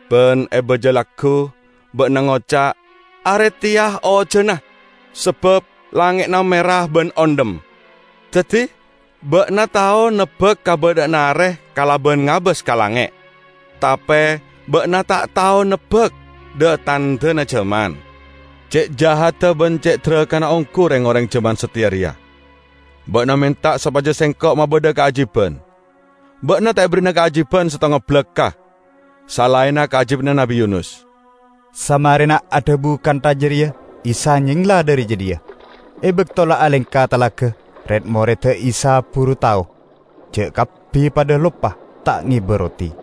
Ban e baja laggu, ba'na ngoca', 'Are teya ojana, sabab langnge'na mera ban ondhem.' Daddi ba'na tao nebbak kabadha'anna are kalaban ngabas ka langnge', tape ba'na ta' tao nebbak dha-tandhana jaman!"] "Ce' jahadda ban ce' darakana onggu reng-oreng jaman sateya reya. Ba'na menta sopaja Sengko' mabadha kaajiban. Ba'na ta' eberri'ana kaajiban settonga balakka' salaenna kaajibanna Nabbi Yunus." Samarena adhabu kantha jareya Isa nyengla dhari jadhiya. E bakto la alengka talaga, red-moredda Isa buru tao ja' kabbi padha loppa ta' ngeba roti.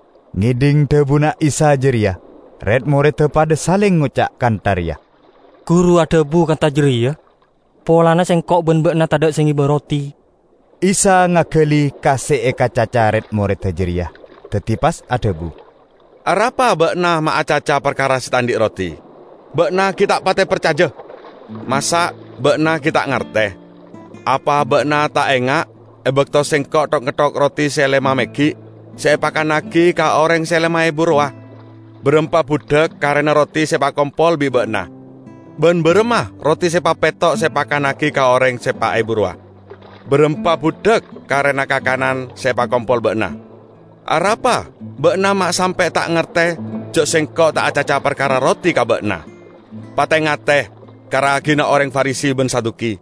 Ngedhing dhabuna Isa jareya, red-moredda padha saleng ngoca' kantha reya, "Guru adhabu kantha jareya polana sengko' ban ba'na tadha' se ngeba roti." Isa ngagali ka se ekacaca red-moredda jareya, daddi pas adhabu, "Arapa ba'na ma' acaca parkara se ta' andhi' roti? Ba'na gi' ta' pate parcaja! Masa' ba'na gi' ta' ngarte? Apa ba'na ta' enga' e bakto Sengko' thok-ngetthok roti se lema meggi' se epakannagi ka oreng se lema ebu rowa? Barampa budhak karena roti se epakompol bi' ba'na? Ban baramma roti se papetto' se epakannagi ka oreng se pa' ebu rowa? Barampa budhak karena kakanan se epakompol ba'na? Arapa ba'na ma' sampe' ta' ngarte ja' Sengko' ta' acaca parkara roti ka ba'na? Pate-ngate ka ragina oreng Farisi ban Saduki!"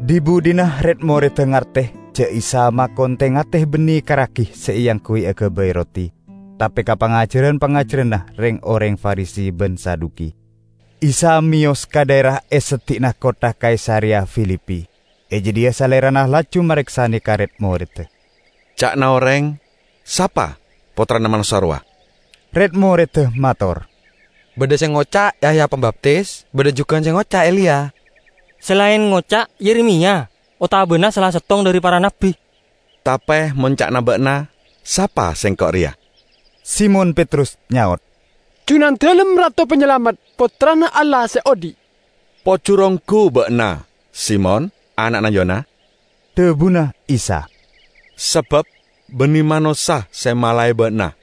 Dhi-budhina red-moredda ngarte ja' Isa makon te-ngate banne ka ragi se eangguy agabay roti, tape ka pangajaran-pangajaranna reng-oreng Farisi ban Saduki. Isa meyos ka dhaera e seddi'na kottha Kaisareya Filipi. E jadhiya Salerana laju mareksane ka red-moredda, "Ca'na oreng, sapa Pottrana Manossa rowa?" Red-moredda mator, "Badha se ngoca' Yahya Pambaptis. Badha jugan se ngoca' Eliya. Se laen ngoca' Yeremiya, otabana sala settong dhari para nabbi." "Tape mon ca'na ba'na, sapa Sengko' reya?" Simon Petrus nyaot, "Junandalem Rato Panyalamet, Pottrana Allah Se Odhi'." "Pojur onggu ba'na, Simon ana'na Yona!" dhabuna Isa. "Sabab banne manossa se malae ba'na,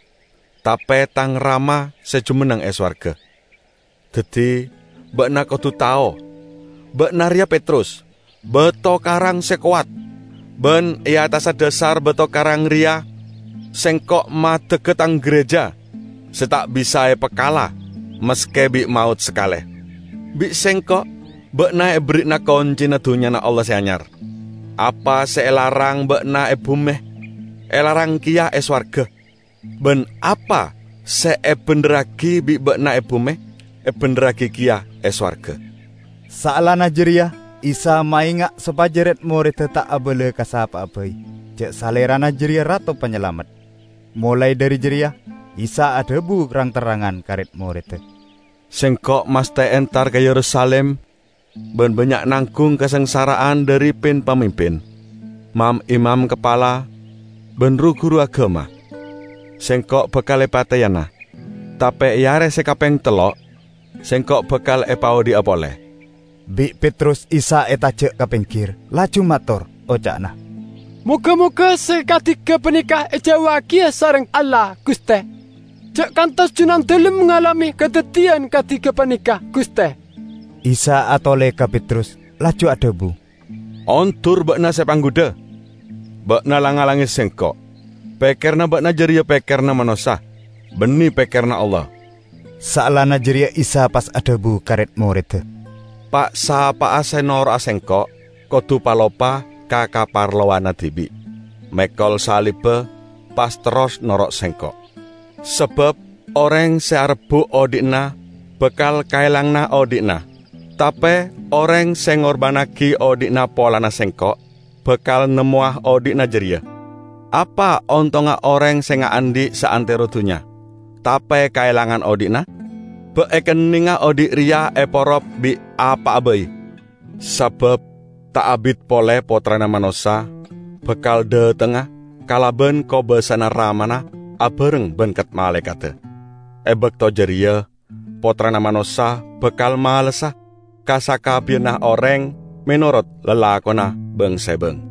tape Tang Rama se jumenneng e sowarga. Daddi ba'na kodu tao, ba'na reya Petrus, bato karang se kowat. Ban e attassa dhasar bato karang reya Sengko' maddegga Tang gereja se ta' bisa epakala maske bi' maot sakale! Bi' Sengko' ba'na eberri'ana koncina Dunnyana Allah Se Anyar. Apa se elarang ba'na e bume, elarang keya e sowarga. Ban apa se ebendherragi bi' ba'na e bume, ebendherragi keya e sowarga." Saellana jareya Isa maenga' sopaja red-moredda ta' abala ka sapa'a bai ja' Salerana jareya Rato Panyalamet. Molae dhari jareya, Isa adhabu rang-terrangan ka red-moredda, "Sengko' masthe entar ka Yerusalim ban bannya' nanggung kasangsara'an dhari pin-pamimpin, mam-imam kapala ban ru-guru agama. Sengko' bakal epateyana, tape e are se kapeng tello' Sengko' bakal epaodhi'a pole." Bi' Petrus Isa etaja' ka penggir laju mator, oca'na, "Moga-moga se kadi gapaneka ejauwagiya sareng Allah, Guste! Ja' kantos Junandalem ngalame kadaddiyan kadi gapaneka, Guste!" Isa atole ka Petrus laju adhabu, "Ondur ba'na, Se Panggudha! Ba'na lang-ngalange Sengko'. Pekkeranna ba'na jareya pekkeranna manossa; banne pekkeranna Allah!" Saellana jareya Isa pas adhabu ka red-morreda, "Pa'-sapa'a se noro'a Sengko', kodu paloppa ka kaparlowanna dibi', mekol salibba, pas terros noro' Sengko'. Sabab oreng se arebbu' odhi'na, bakal kaelangana odhi'na. Tape oreng se ngorbannagi odhi'na polana Sengko', bakal nemmowa odhi'na jareya. Apa ontongnga oreng se ngaandhi' saantero dunnya tape kaelangan odhi'na? Ba' ekennenga odhi' reya eporop bi' apa'a bai? Sabab ta' abit pole Pottrana Manossa bakal dhatengnga kalaban kobasana Ramana abareng ban kat-malaekadda. E bakto jareya Pottrana Manossa bakal malessa ka sakabbiyanna oreng menorot lalakonna bang-sebang.